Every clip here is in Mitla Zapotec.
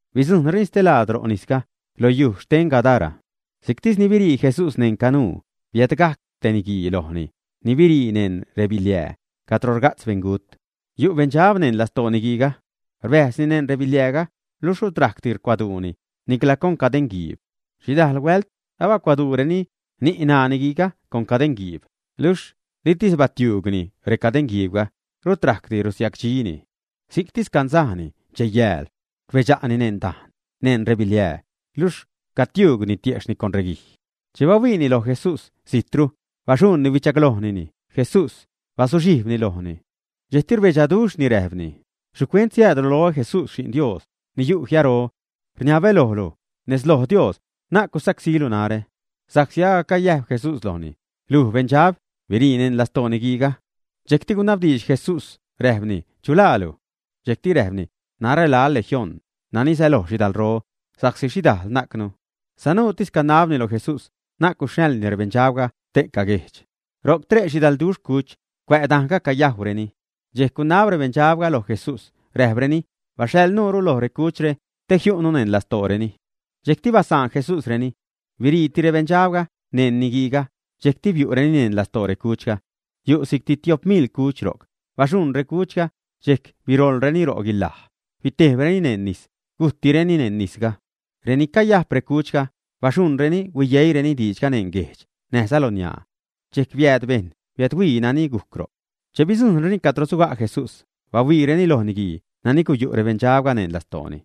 Bidzujṉtireni stelaad ro' nisga, lo yuj xten Gadara. Si'ctis ni birii Jesús neṉ canuu, biädgajc te niguii lojni ni birii neṉ rebiliää cadro rga'tz beṉgut. Yu' beṉdxab neṉ lastoo niguiiga. Rbäjzni neṉ rebiliääga luxh rut rajcdi rucuaduuni, nicla con cadeṉguiib. Xhidajl huält agacbacuaduureni ni', ṉaa niguiiga con cadeṉguiib, luxh litis batiuugni recadeṉguiibga, rut rajcdi rusiacdxini. Si'ctis canzajni, dxej, yääl. Rbedxa'ni neṉ redajn, neṉ rebiliää, luxh cagutiuugni tiejxhni con reguij. Che bahuiini loj Jesús zijtru, baxuṉni huichaglojni Jesús, bazuxhijbni lojni. Dxejcti rbedxaduxhni, räjpni: ―¿Xhicuent siäädlu loä, Jesús, Xi'n Dios ni yu' jiaro? Rniabä lojlu nez loj Dios na'c gusacsílu narä. Sa'csi agac cayäjb Jesús lojni: ―Luj, beṉdxab, birii neṉ lastoo niguiiga. Dxejcti gunabdiidx Jesús räjpni: ―¿Chu laalu? Dxejc räjpni: ―Narä laä Legión, nani säloj xhidalro, sa'csi xhidajl najcnu. Sanuutis canabni lo Jesús na'c guxhaḻni rebeṉdxabga ste'ca guejdx. Ro'c tre' xhidalduxh cuch cuä' dane'ga, cayajwreni. Dxejc gunab rebeṉdxabga loj Jesús, räjpreni: ―Baxhaḻ nuure loj recuchre te jiu'nu neṉ lastooreni. Dxejcti basaan Jesúsreni. Biriiti rebeṉdxabga neṉ niguiiga, dxejc biu'reni neṉ lastoo recuchga. Yu' si'cti tiop miḻ cuch ro'c. Baxuṉ recuchga, dxejc biroḻreni ro' guilaj, bitejbreni neṉ nis, gujttireni neṉ nisga. Renani cayajp recuchga baxuṉreni, huiyeiireni diidxga neṉ guejdx, näjza loniaa. Dxejc biääd bejṉ biädhuii nani gujc ro'c. Che bidzujṉreni cadro suga' Jesús, bahuiireni loj niguii nani guyu' rebeṉdxabga neṉ lastooni.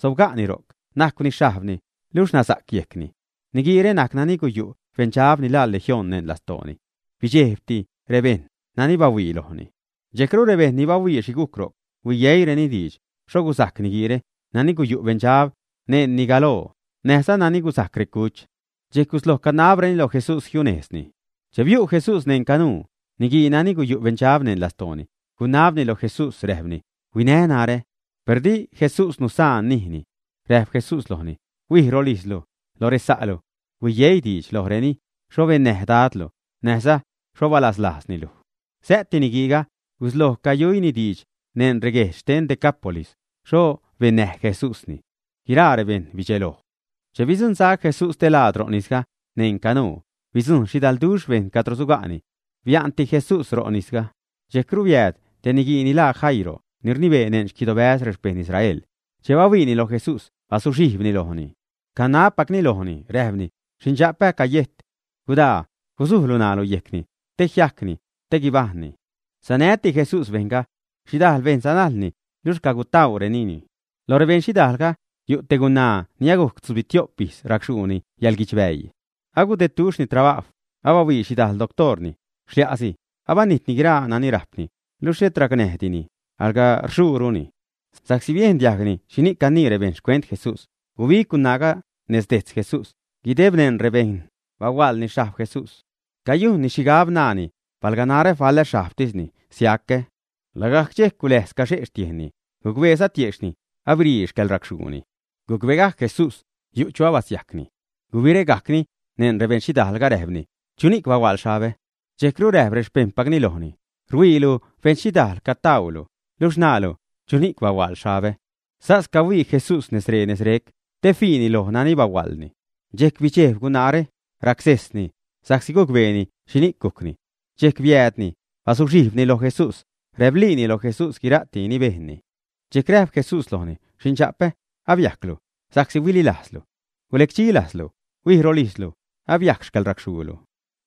Sobga'ni ro'c, najcwni xhajbni luxh nasa'c yejcni. Niguiire najc nani guyu' beṉdxab ni laa Legión neṉ lastooni. Bidxejbti rebejṉ nani bahuii lojni. Dxejcru rebejṉ ni bahuii xhi gujc ro', huiyeiireni diidx xho guzajc niguiire nani guyu' beṉdxab neṉni galoo, näjza nani guzajc recuch. Dxejc gusloj canabreni loj Jesús jiunejzni. Che biu' Jesús neṉ canuu, niguii nani guyu' beṉdxab neṉ lastooni gunabni loj Jesús, räjpni: ―Huinä narä. Per di Jesús nusaan nijni. Räjp Jesús lojni: ―Huij rolijzlu, lo resa'lu. Huiyeii diidx lojreni xho bennäj Dadlu, näjza xho balaslajzni luj. Sä'ti niguiiga, gusloj cayujyni diidx neṉ reguejdx xten Decápolis xho bennäj Jesúsni. Guiraa rebejṉ bidxeloj. Che bidzuṉsac Jesús stelaad ro' nisga neṉ canuu, bidzujṉ xhidalduxh bejṉ cadro suga'ni. Bia'nti Jesús ro' nisga. Dxejcru biääd te niguii nani laa Jairo, ni rnibee neṉ xquidobäz rexpeṉ Israel. Che bahuiini loj Jesús, bazuxhijbni lojni. Canabpacni lojni, räjpni: ―Xindxapä'ä acayejt. Gudaa, guzujlu ṉaalu yejcni, te jiajcni, te guibajṉni. Sanäti Jesús bejṉga. Xhidajl bejṉ sanajlni, luxh cagutäärenini. Loj rebeṉxhidaalga yu' te gunaa ni agujc tzubitio'p ijz racxhuuni yäḻguidxbäii. Agudedduxhni trabajw, abahuii xhidajl doctoorni. Xlia'si abanijtni guiraa nani rajpni, luxh xhet racnäjdini, alga rxuuruni. Sa'csi biejn diajgni xhini'c canii rebejṉ xcuent Jesús, gubig gunaaga nez dejtz Jesús, guideb neṉ rebejṉ, bahuaḻni xhajb Jesús. Cayujnni xhigab, naani: “Palga narä faḻä xhajbtisni, siacä.” Lagajc dxejc guläjz caxe' xtiejnni, gucbeeza tiejxhni abirii xcäḻracxhuuni. Gucbegajc Jesús yu' chu abasiajcni. Gubiregajcni neṉ rebeṉxhidaalga, räjpni: ―¿Chuni'c bahuaḻ xhabä? Dxejcru räjp rexpejṉpacni lojni: ―Rhuiilu beṉxhidaal cagutäälu, luxh naalu: “¿Chuni'c bahuaḻ xhabä?” Sas cahuii Jesús nez ree, nez rec, te fiini loj nani bahuaḻni. Dxejc bidxejb gunaare, racsejsni, sa'csi gucbeeni xhini'c gujcni. Dxejc biäädni, bazuxhijbni loj Jesús, räbliini loj Jesús guira'ti ni bejnni. Dxejc räjp Jesús lojni: ―Xindxa'pä, abiajclu sa'csi huililajzlu. Gulecdxi lajzlu, huij rolijzlu, abiajc xcäḻracxhuulu.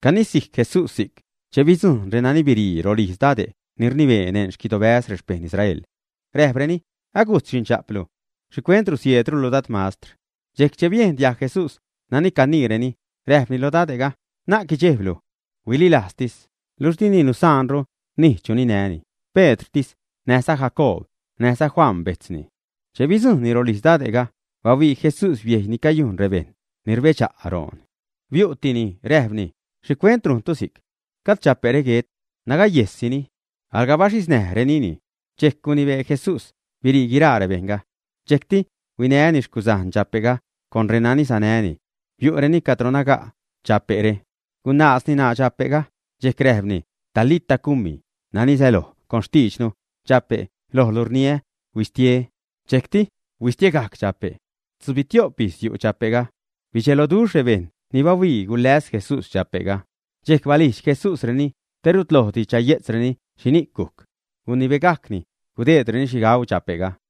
Canisijc Jesús si'c che bidzujṉ renani birii rolijz dade' ni rnibee neṉ xquidobäz rexpejṉ Israel. Räjpreni: ―Agujt xindxape'lu. ¿Xhicuent rusieedrulu Dad mastr? Dxejc che biejn diajg Jesús nani caniireni, räjpni lo dade'ga: ―Na'c guidxejblu. Bililajztis. Luxh dini nusaanru nij chu ninäni, Pedrtis näj Jacoob näjza Juan bejtzni. Che bidzujṉni rolijz dade'ga, bahuii Jesús biejy ni cayujn rebejṉ ni rbedxa' roon. Biu'tini räjpni: ―¿Xhicuent rujntu si'c? Gajd dxape're guet. Nagayejssini. Alga baxhiznäjrenini. Dxejc gunibee Jesús birii guiraa rebejṉga. Dxejcti huinäni xcuzajn dxape'ga con renani sanäni. Biu'reni cadro naga' dxape're. Gunaazni ṉaa dxape'ga, dxejc räjpni: ―Talita cumi ―nani säloj con xtiidxnu: Dxape', lojlu rniä, huistie. Dxejcti huistiegajc dxape'. Tzubitio'p ijz yu' dxape'ga. Bidxeloduxh rebejṉ ni bahuii guläs Jesús dxape'ga. Dxejc balijdx Jesús reni te rut lojdi chaye'tzreni xhini'c gujc. Gunibegajcni gudeedreni xhi gauu dxape'ga.